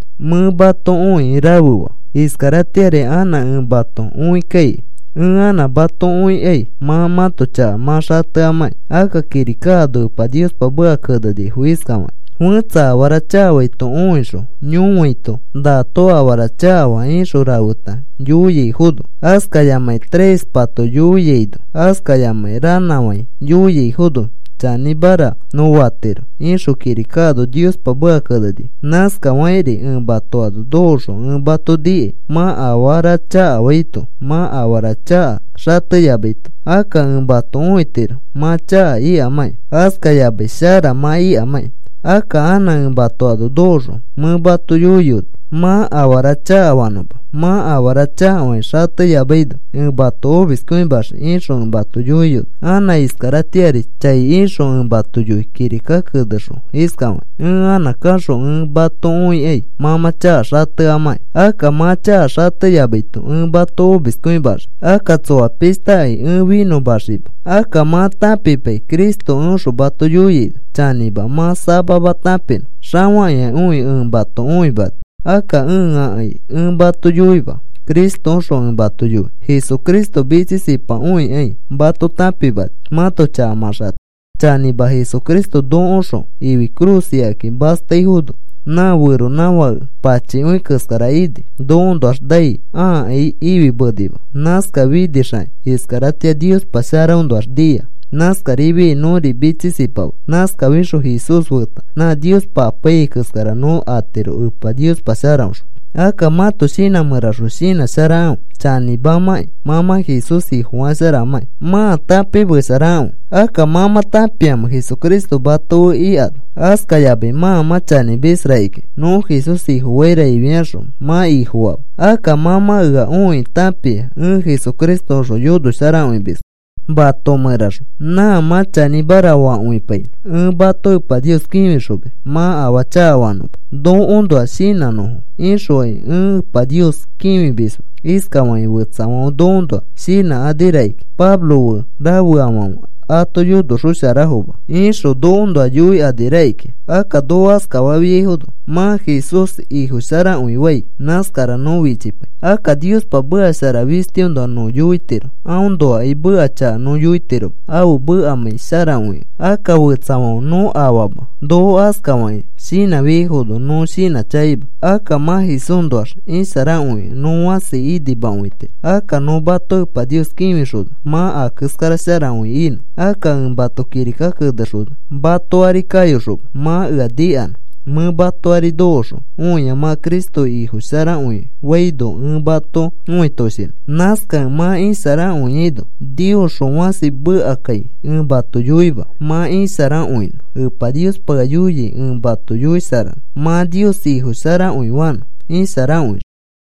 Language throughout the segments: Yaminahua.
Mẽ mato õikĩ rafe faa. Iskaratĩari anã ẽ mato õikaikai. Ẽ anã mato õikaikai mã mãto chaka mã xateamãkĩ. Akka kirika ano Epa Niospa meka kenenifo iskafakĩ: “Fẽtsa afara chakafaito õixõ yõfaito, ‘Nato afara chakafaa,’ ixõ rafeta yoiaifono, askayamakĩ trespa yoiaino askayamakĩ ranãfai yoiaifono chanĩmara nõ fatiro,” ixõ kirika ano Niospa meka kenenifo. Nãskafakĩri ẽ mato ano nokoxõ ẽ nikai mã afara chakafaito mã afara chaka xateyamaito. Akka ẽ mato õitiro mã chaka ikamãki, askayamai shara mã ikamãki. Akka anã ẽ mato ano kayoxõ mẽ mato yoiyoni mã afara chakafanõma. “Mã afara chakafakĩ xateyamaino ẽ mato omiskõimaxii,” ixõ ẽ mato yoiyoni. Anã iskaratĩari chai ixõ ẽ mato yoi kirika kenexõ iskafakĩ: “Ẽ anã kaxõ ẽ mato õikai mã mã chaka xateamãki. Akka mã chaka xateyamaito ẽ mato omiskõimaxii. Akka tsoa pishtakai ẽ finõmaxima.” Akka mã tãpipai Cristo eõxõ mato yoiaino. Chanĩma, mã samama tãpinõ xafakĩakõi ẽ mato õimani. Akka ẽakai ẽ mato yoima, Cristoõxõ ẽ mato yoi. Jesucristo mitsisipakõikai mato tãpimani mãto chaka mã xatenõ. Chanĩma, Jesucristo nokoõxõ ifi cruz ikakĩ mastaifono nã feronãfake pachikõi keskara ini. Nokoõnoax nai ãakai ifimenima. Nãskafinixakĩ iskaratĩa Niospa sharaõnoax nia. Nãskarifiai nõri mitsisipama. Nãskafixõ Jesús feta nã Niospa apaiyai keskara nõ atiro Epa Niospa sharaõxõ. Akka mãto shinã mẽraxõ shinãsharakãfe chanĩmamãkĩ mã mã Jesús Ifofasharamãkĩ. Mãa tãpimesharakãfe. Akka, ¿mã mã tãpiamẽ Jesucristo mato fe ikano? Askayamai mã mã chanĩmis rakikĩa nõ Jesús Ifofaira ifiaxõ mã Ifofaama. Akka mã mã ea õikĩ tãpia ẽ Jesucristoõxõ yonosharakõimiskẽ mato mẽraxõ. Nã mã chanĩmara fakõipainõ. Ẽ mato Epa Nios kĩfixomis mã afaa chakafanõma. Nokoõnoa shinãnõfo ixokai ẽ Epa Nios kĩfimisma. Iskafakĩ fetsafãfe nokoõnoa shinãkani rakikĩa: “Pablo fe rafeafãfe ato yonoxosharafoma,” ixõ nokoõnoa yoikani rakikĩa. Akka noko askafafiaifono mã Jesús Ifosharakõifai nãskara nõ fichipai. Akka Niospa meka shara fistiõnoa nõ yoitiro. Aõnoakai meka chaka nõ yoitiroma ãfe mekamãi sharakõikẽ. Akka fetsafãfe nõ afama noko askafakĩ shinãfiaifono nõ shinãchakaima. Akka mã Jesúsnoax isharakõikẽ nõ fãsi inimakõitiro. Akka nõ mato Epa Nios kĩfixona mã a keskara sharakõi inõ. Akka ẽ mato kirika kenexona mato ari kayoxoma mã ea nikanõ. Mẽ mato ari nokoxõ õia mã Cristo Ifo sharakõifaino ẽ mato õitoshinõ. Nãskakẽ mã isharakõiaino Niosxõ fãsi mekakai ẽ mato yoima mã isharakõinõ. Epa Niospa ea yoia ẽ mato yoisharanõ mã Nios Ifo sharakõifanõ isharakõixõ.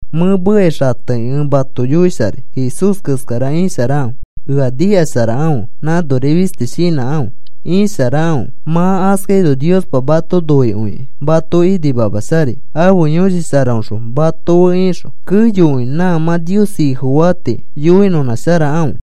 Mẽ mekai xatekĩ ẽ mato yoisharai. Jesús keskara isharakãfe. Ea nikasharakãfe. Nãnori fisti shinãkãfe. Isharakãfe. Mã askaino Niospa mato noikõikĩ mato inimamasharai ãfe Yõshi Sharaõxõ mato fe ixõ. Keyokõi nã mã Nios Ifofaa tii yoinõnãsharakãfe.